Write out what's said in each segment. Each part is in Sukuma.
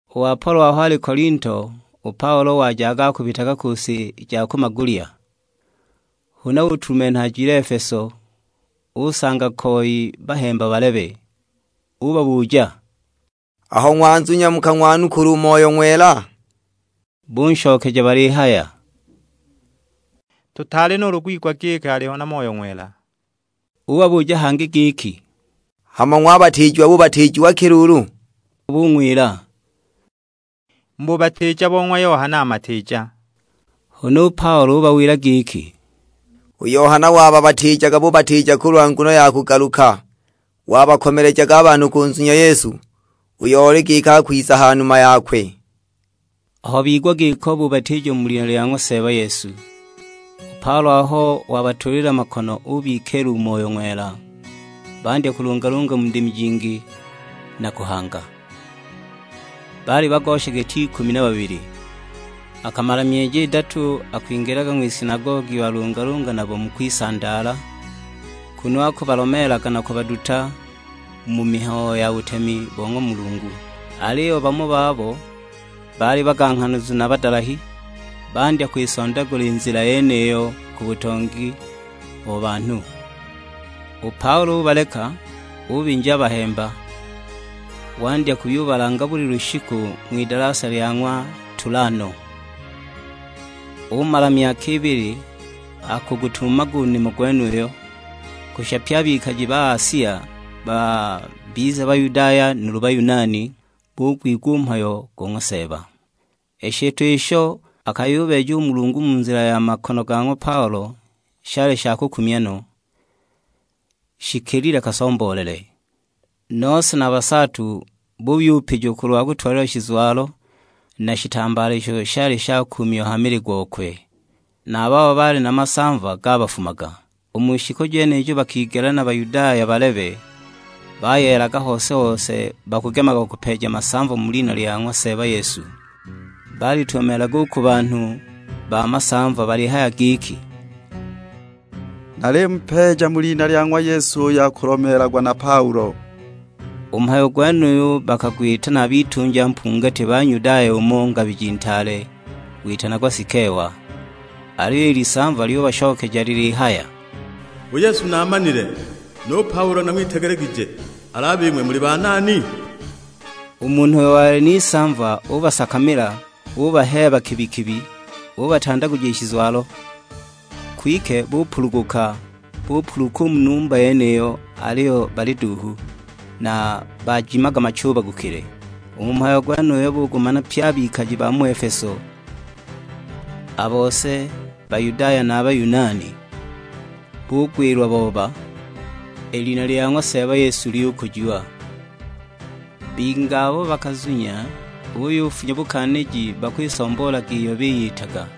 U Apolo aho ali Kolinto, u Paulo wajaga akubitaga ku si ja ku magulya. Huna utulumenha ajile Efeso; usanga koi bahemba balebe. Ubabuja, "Aho ng'wazunya mukang'wanukula u Moyo Ng'wela?" Bunshokeja balihaya, "Tutaali nuulu kwigwa giki aliho na Moyo Ng'wela!" Ubabuja hangi giki, "Hama ng'wabatiijiwa bubatiijiwa ki luulu?" Nabo bung'wila, "Mu bubatiija bo ng'wa Yohana Matiija." Huna u Paulo ubawila giki, "U Yohana wabatiijaga bubatiija kulwa nguno ya kugaluka; wabakomelejaga a banhu kunzunya Yesu, uyo oli giki akwiza ha numa yakwe." Aho bigwa giko bubatiijiwa mu lina lya ng'wa Seeba Yesu. U Paulo aho wabatuulila makono ubikiila u Moyo Ng'wela, bandya kulungalunga mu ndimi jingi, na kuhanga. Baali bagosha giti ikumi na babili. Akamala myeji idatu akwingilaga ng'wisinagogi walungalunga nabo mu kwisandaala, kunu akubalomeelaga na kubaduta mu mihayo ya butemi bo ng'wa Mulungu. Aliyo bamo babo baali baganghanazu na badalahi, bandya kwisondagula i Nzila yeniyo ku butongi bo banhu. U Paulo ubaleka, ubinja a bahemba; wandya kuyubalanga buli lushiku ng'widalasa lya ng'wa Tulano. Umala myaka ibili akugutumamaga u nimo gwenuyo, kushisha pye a bikaji ba Asia, babize Bayudaya nuulu Bayunani, bugwigwa u mhayo go ng'wa Seeba. I shitwa isho akayubeeja u Mulungu mu nzila ya makono ga ng'wa Paulo shali sha kukumya no, shikilile kasomboolele! Nose na basaatu buyupijiwa kulwa kutwalilwa shizwalo na shitambaala isho shali shakuumiwa ha mili gokwe; na a babo baali na masamva gabafumaga. U mu shiku jenijo bakigela na Bayudaya balebe, bayeelaga hose-hose bakugemaga kupeeja masamva mu lina lya ng'wa Seeba Yesu. Balitumamilaga u ku banhu ba masamva balihaya giki, "Nalimupeeja mu lina lya ng'wa Yesu uyo akulomeelagwa na Paulo." U mhayo gwenuyu bakagwita na bitunja mpungati ba Nyudaya umo ngabiji ntaale, witanagwa Sikewa. Aliyo i lisamva lyubashokeja lilihaya, "U Yesu naamanile, nu Paulo nang'witegelegije, al'a bing'we muli banani?" U munhu uyo wali n'isamva ubasakamila, ubaheeba kibi-kibi; ubatandaguja i shizwalo! Kwike bupuluguka, bupuluka u mu numba yeniyo, aliyo bali duuhu, na bajimaga machubagukile! U mhayo gwenuyo bugumana pye a bikaji ba mu Efeso; a bose, Bayudaya na a Bayunani, bugwilwa booba. I lina lya ng'wa Seeba Yesu lyukujiwa. Bingi abo bakazunya buyufunya bukaaniji bakwisomboolaga iyo biyitaga.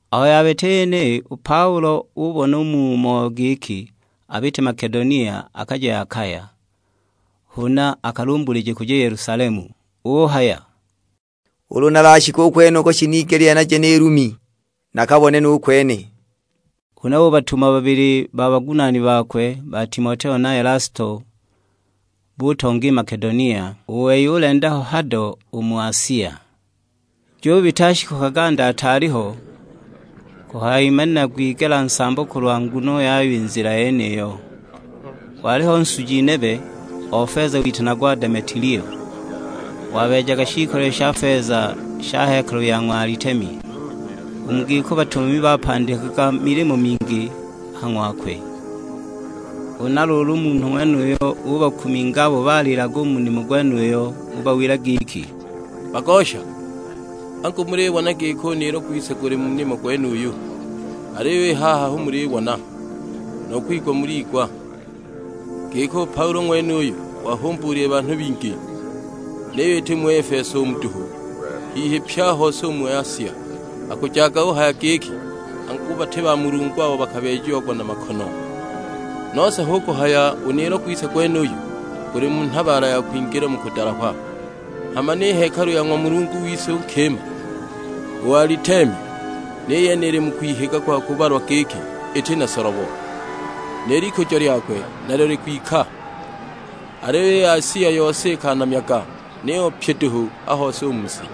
Aho yabita i yeniyi, u Paulo ubona u mu moyo giki abite Makedonia akaje Akaya, huna akalumbulile kuja Yelusalemu; uhaya, "Ulu nalashike u kwenuko shinigelile naje ni Lumi nakabone nu kwene." Huna ubatuma babili ba bagunaani bakwe, ba Timoteo na Elasto, butonga i Makedonia; u wei ulenda ho hado u mu Asia. Jubita shiku kaganda ataali aliho, kuhayimanila gwigela nsambo kulwa nguno yayo i Nzila yeniyo. Waliho nsuji nebe o feza witanagwa Demetilio, wabeejaga shiikolile sha feza sha hekalu ya ng'wa Alitemi. U mu giko batumami bapandikilaga milimo mingi a ha ng'wakwe. Huna luulu u munhu ng'wenuyo ubakuminga abo baliilaga u mu nimo gwenuyo; ubawila giki, "Bagosha, angu mulibona giki u niilo gwise guli mu nimo gwenuyu. Aliyo i haha hu mulibona, nu kwigwa muliigwa, giki u Paulo ng'wenuyu wahumbuulile banhu bingi. Niyo iti mu Efeso umu duhu, hihi pye a hose u mu Asia; akujaga uhaya giki angu bati bamulungu abo bakabeejiagwa na makono. Nose hu kuhaya u niilo gwise gwenuyu guli mu nhabaala ya kwingila mu kudalahwa; hama ni hekalu ya ng'wa mulungu wise u nkima, u Alitemi ni yene ili mu kwihiga kwa kubalwa giki iti na solobo. Ni likujo lyakwe nalyo likwika, aliyo i Asia i yose ikanamyaga; niyo pyi duhu a hose u mu si."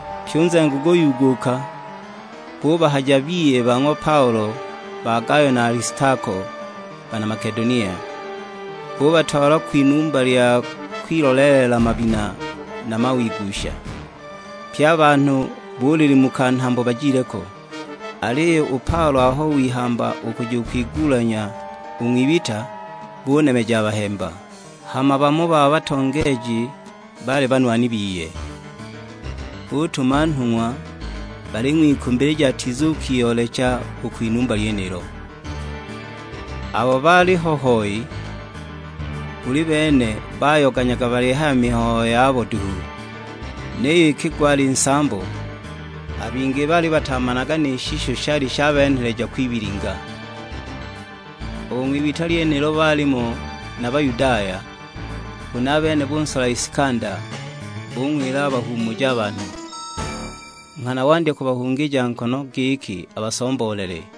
Pyi u nzengo guyuuguka, bubahaja biye ba ng'wa Paulo, ba Gayo na Alistako bana Makedonia, bubatwala kwinumba lya kwiloleelela mabina na mawigusha; pye a banhu bulilimuka nhambo bajile ko. Aliyo u Paulo aho wihamba u kuja kwigulanya u ng'wibita, bunemeja a bahemba. Hama bamo ba batongeeji baali banwani biye, butuma nhung'wa baling'wikumbilija atizukiyoolecha u kwinumba lyenilo. Abo baaliho hoi, buli bene bayoganyaga balihaya mihayo yabo duhu. Niyo iki gwali nsambo, a bingi baali batamanaga ni shisho shali shabenheleja kwibilinga. U ng'wibita lyenilo baalimo na Bayudaya; huna a bene bunsola Isikanda, bung'wila abahuumuje a banhu. Nghana wandya kubahungija nkono giki abasomboolele.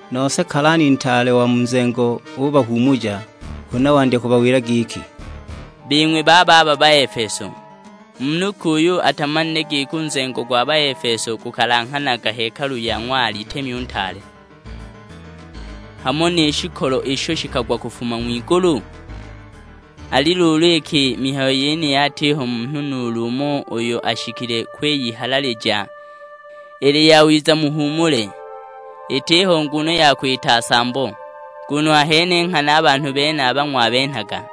Nose kalani ntaale wa mu nzengo ubahuumuja, huna wandya kubawila giki, "Bing'we bababa Baefeso, munhu ki uyo atamanile giki u nzengo gwa Baefeso gukalanghanaga hekalu ya ng'wa Alitemi u ntaale, hamo ni shikolo isho shikagwa kufuma ng'wigulu? Ali luulu iki i mihayo yeniyi atiho munhu nuulu umo uyo ashikile kwiyihalalija, ili yawiza muhuumule; itiho nguno ya kwita nsambo. Nguno ahene nghana a banhu benaba ng'wabenhaga,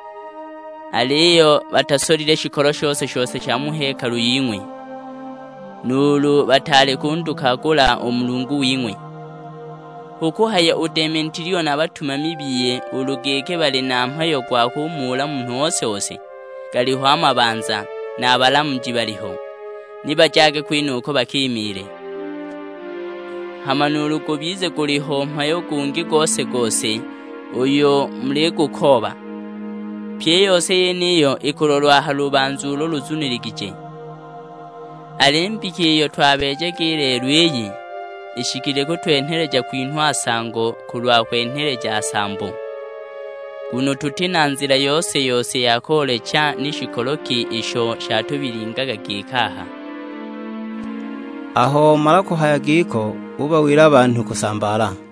aliyo batasolile shikolo shose-shose sha mu hekalu ying'we, nuulu bataali kundukagula u mulungu wing'we. Hu kuhaya u Demetilio na a batumami biye ulu giki bali na mhayo gwa kumuula munhu ose-ose, galiho a mabanza, na a balamuji baliho; ni bajage kwenuko bakimiile. Hama nuulu gubize guliho mhayo gungi gose-gose uyo muligukooba, pyi i yose yeniyo ikulolwa ha lubanza ulo luzuniligije. Al'i mbika iyo twabeejaga i lelo iyi, ishikile kutwenheleja kwinhwa nsango kulwa kwenheleja nsambo, nguno tuti na nzila yose-yose ya koolecha ni shikolo ki isho shatubilingaga giki aha." Aho omala kuhaya giko ubawila a banhu kusambaala.